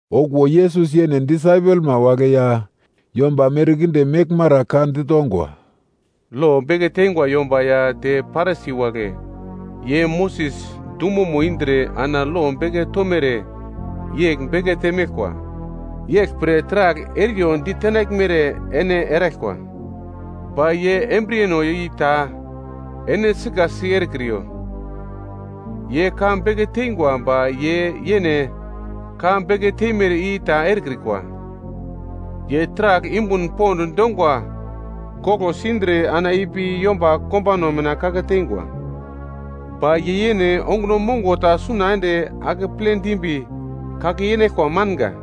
Okuwo Yesus yene disaipelma wagle ya yomba merkinde meglmara ka ditongwa, “Lo beke teingwa yomba ya te Parisi wagle ye Moses dumomo indre ana lo beke tomere yegl bekete meglkwa. Yeglpre taragl eriyo ditenaglmere ene eraglkwa. Ba ye embriyeno i ta ene sikasi erekriyo. Ye ka beke teingwa ba ye yene ka beke teimere i ta erekrikwa. Ye taragl yumbun pond dongwa koglo sindre ana ipi yomba kombano mina kake teingwa. Ba ye yene onguno mongo ta suna ende akeple dimbi kake yenaglkwa manga.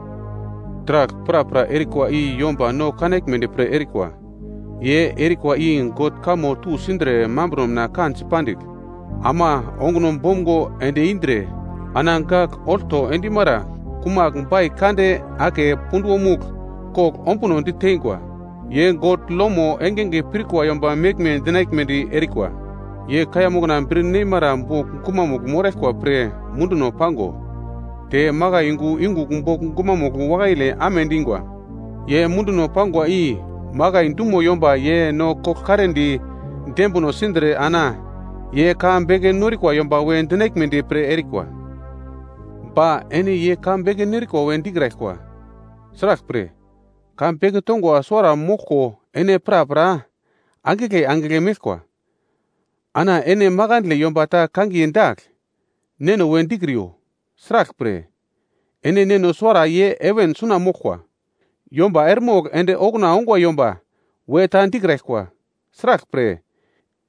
“Taragl prapra erikwa i yomba no kanaglmedi pre erikwa. Ye erikwa i God kamo tusindre mambro mina kansi pandigl, ama onguno bomgo ende indre, ana gagl olto endimara kumagl bai kande ake punduwomugl kogl ombuno diteingwa. Ye God lomo engenge pirkwa yomba meglme dinaglmedi erikwa. Ye kaiya mokna bir nemara bogl gumamugl moraglkwa pre munduno pango, te makai yungu yungugl bogl gumamugl wakaile amedingwa. Ye munduno pangwa i makai dumo yomba ye no koglkaredi dembino sindre ana ye ka beke norikwa yomba we dinaglmedi pre erikwa. “Ba ene ye ka beke nerikwa we dikraglkwa, sraglpre, ka beke tongwa suwara moglko ene prapra angigle angigle meglkwa. Ana ene makandle yomba ta kangiye dagl, neno we dikriyo. Sraglpre, ene Neno suwara ye heven suna moglkwa. Yomba eremogl ende okuna ongwa yomba we ta dikraglkwa, sraglpre,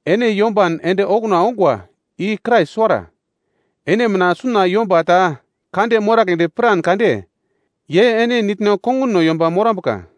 ene yomban ende okuna ongwa i Krais suwara. Ene mina suna yomba ta kande moragledi piran kade, ye ene nitno konguno yomba morambuka.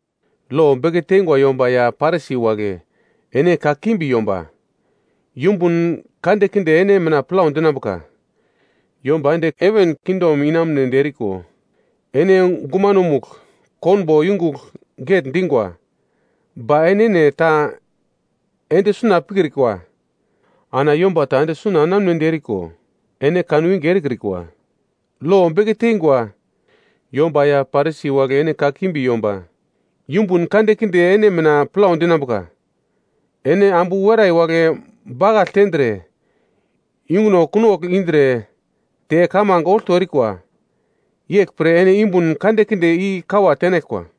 “Lo beke teingwa yomba ya Parisi wagle. Ene kakimbi yomba! Yumbun kandekinde ene mina plau dinambuka. Yomba ende heven kingdom enamunedi eriko, ene gumanomugl konbo yongugl getndingwa. Ba ene enene ta ende suna pikrikwa. Ana yomba ta ende suna enamunedi eriko, ene kanwinge erekrikwa. Lo beke teingwa yomba ya Parisi wagle ene kakimbi yomba. Yumbun kandekinde ene mina plau dinambuka. Ene ambu werai wagle bakagl tendre, yunguno kunogl indre te kamange olto erikwa. Yeglpre ene yumbun kandekinde i-kawa tenaglkwa.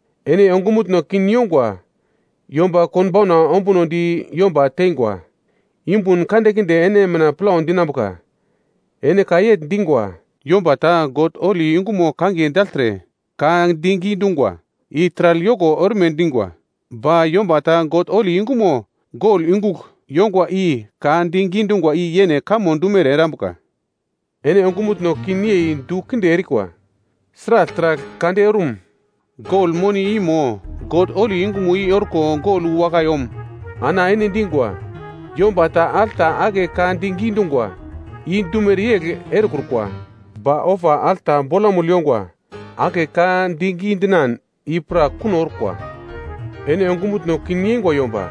“Ene ongumutno kin yongwa yomba konbauna ombunodi yomba tengwa! Yumbun kandekinde ene mina plau dinambuka! Ene ka yegl dingwa: ‘Yomba ta God holi yungumo kangiye dagltre ka digi dungwa, i taragl yoko orme dingwa. Ba yomba ta God holi yungumo gol yungugl yongwa i ka digi dungwa i yene kamo dumere erambuka.’ Ene ongumutno kin yei du kinde erikwa! Sragl taragl kande orum? Gol moni i mo, God holi yungumo i orko gol wu wakai om? Ana ene dingwa, ‘Yomba ta alta ake ka digi dungwa, i dumere yegl erekrukwa. Ba ofa alta bolamugl yongwa ake ka digi dinan, i pra kuno orkwa.’ Ene ongumutno kin yeingwa yomba!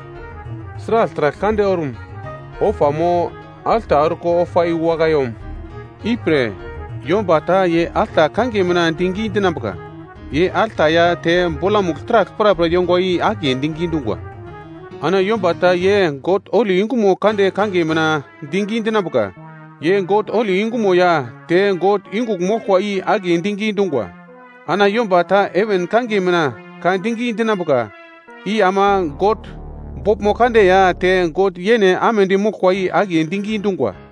Sragl taragl kande orum? Ofa mo, alta orko ofa i wu wakai om? Ipre, yomba ta ye alta kangiye mina digi dinambuka, ye alta ya te bolamugl taragl prapra yongwa i akiye digi dungwa. Ana yomba ta ye God holi yungumo kande kangiye mina digi dinambuka, ye God holi yungumo ya te God yungugl moglkwa i akiye digi dungwa. Ana yomba ta heven kangiye mina ka digi dinambuka, i ama God boglmo kande ya te God yene amedi moglkwa i akiye digi dungwa.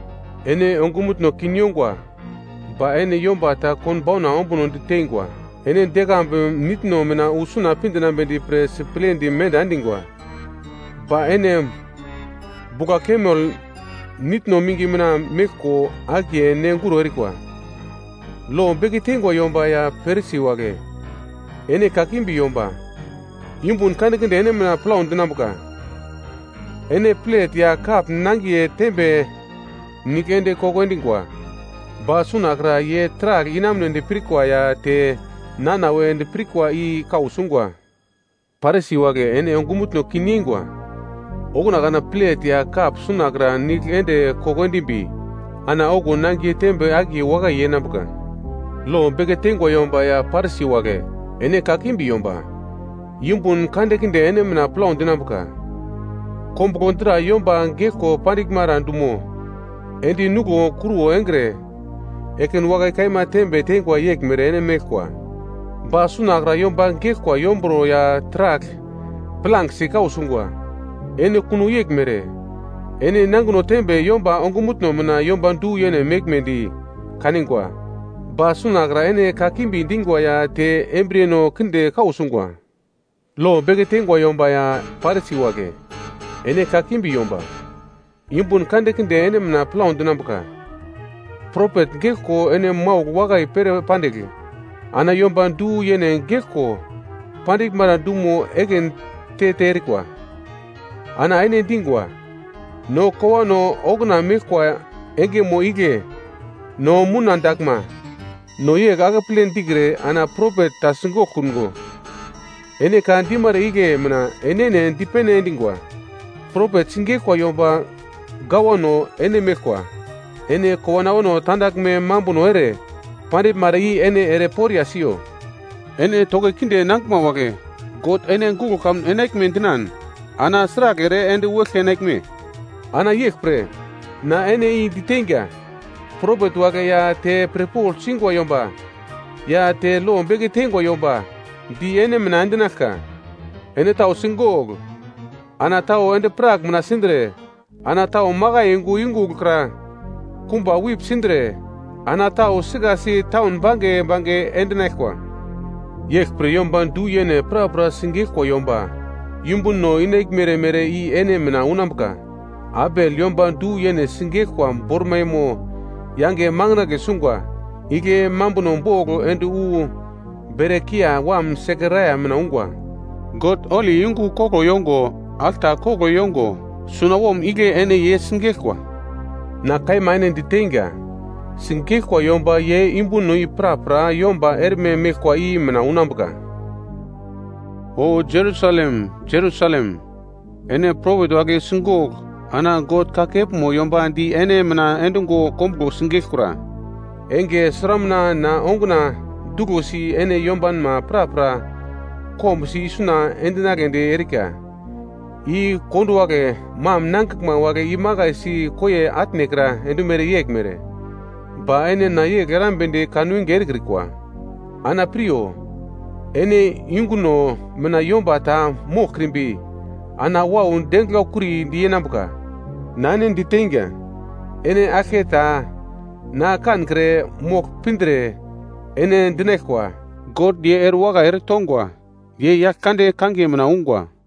Ene ongumutno kin yongwa, ba ene yomba ta konbauna ombuno ditengwa! Ene dekambu nitno mina wu suna pi dinambedi pre siplendi menda endingwa, ba ene bugla-kamel nitno mingi mina meglko akiye nenguro erikwa. “Lo beke teingwa yomba ya Parisi wagle. Ene kakimbi yomba, yumbun kandekinde ene mina plau dinambuka! Ene plet ya kap nangiye tembe nigl ende koko endingwa, ba sunakra ye taragl inamunedi pirkwa ya te nana we dipirkwa i kau sungwa. Parisi wagle ene ongumutno kin yengwa! Okuna kana plet ya kap sunakra nigl ende koko endimbi, ana okuwo nangiye tembe akiye wakai yenambuka. “Lo beke teingwa yomba ya Parisi wagle, ene kakimbi yomba! Yumbun kandekinde ene mina plau dinambuka! Kombuglo dra yomba geglko pandiglmara dumo, endi nuglo kruwo engre, ekin wakai kaima tembe tengwa yeglmere ene meglkwa. Ba sunakra yomba geglkwa yomburo ya taragl plangesi kau sungwa. Ene kuno yeglmere. Ene nangino tembe yomba ongumutno mina yomba du-yene meglmedi kanigwa, ba sunakra ene kakimbi dingwa ya te embriyeno kinde kau sungwa. “Lo beke teingwa yomba ya Parisi wagle, ene kakimbi yomba! Yumbun kandekinde ene mina plau dinambuka! Propet geglko ene maugl wakai pere pandigl, ana yomba du-yene geglko pandiglmara dumo ekin te-te erikwa. Ana ene dingwa, ‘No kowano okuna meglkwa engemo igle no mouna daglma, no ye akeple dikre ana propet ta sigoglkungo.’ Ene ka dimara igle mina enene dipene endingwa, propet sigeglkwa yomba gawano ene meglkwa. Ene kowano awano tandaglme mambuno ere pandiglmara i ene ere poriya siyo! “Ene toki kinde nangiglma wagle! God ene guglo kamun enaglme dinan ana sragl ere ende wu eglke enaglme? Ana yeglpre, na ene i diteinga, propet wagle ya te pirpogl singwa yomba ya te lo beke teingwa yomba di ene mina endinaglka. Ene tau sigogl, ana tau endi-prak mina sindre, ana tau makai yungu yungugl kra kumba wip sindre, ana tau sikasi taun bange bange endinaglkwa. Yeglpre yomba du-yene prapra sigeglkwa yomba yumbuno inaglmere mere i ene mina unambuka. Abel yomba du-yene sigeglkwa bormaimo yange makandle sungwa. Igle mambuno bogl ende wu Berakiya wam Sekaraia mina ungwa. God holi yungu koglo yongo alta koglo yongo sunawom igle ene ye sigeglkwa. Na kaima ene diteinga, sigeglkwa yomba ye yumbuno i prapra yomba erme meglkwa i mina unambuka. “O Jerusalem, Jerusalem, ene propet wagle sigogl ana God kakepmo yomba di ene mina endungo kombuglo sigeglkura. Enge sramuna na onguna duglosi ene yombanma prapra kombusi isuna endinagledi erika, i konduwagle mam nangiglma wagle imakai si koiye atnekra endumere yeglmere, ba ene na yegl erambedi kanwinge erekrikwa. Ana piryo, ene yunguno mina yomba ta moglkrimbi ana wau denglau-kuridi yenambuka. Na ene diteinga, ene aglketa na kankre mogl pindre, ene dinaglkwa, ‘God ye erewakai eretongwa, ye Yaglkande kangiye mina ungwa.’”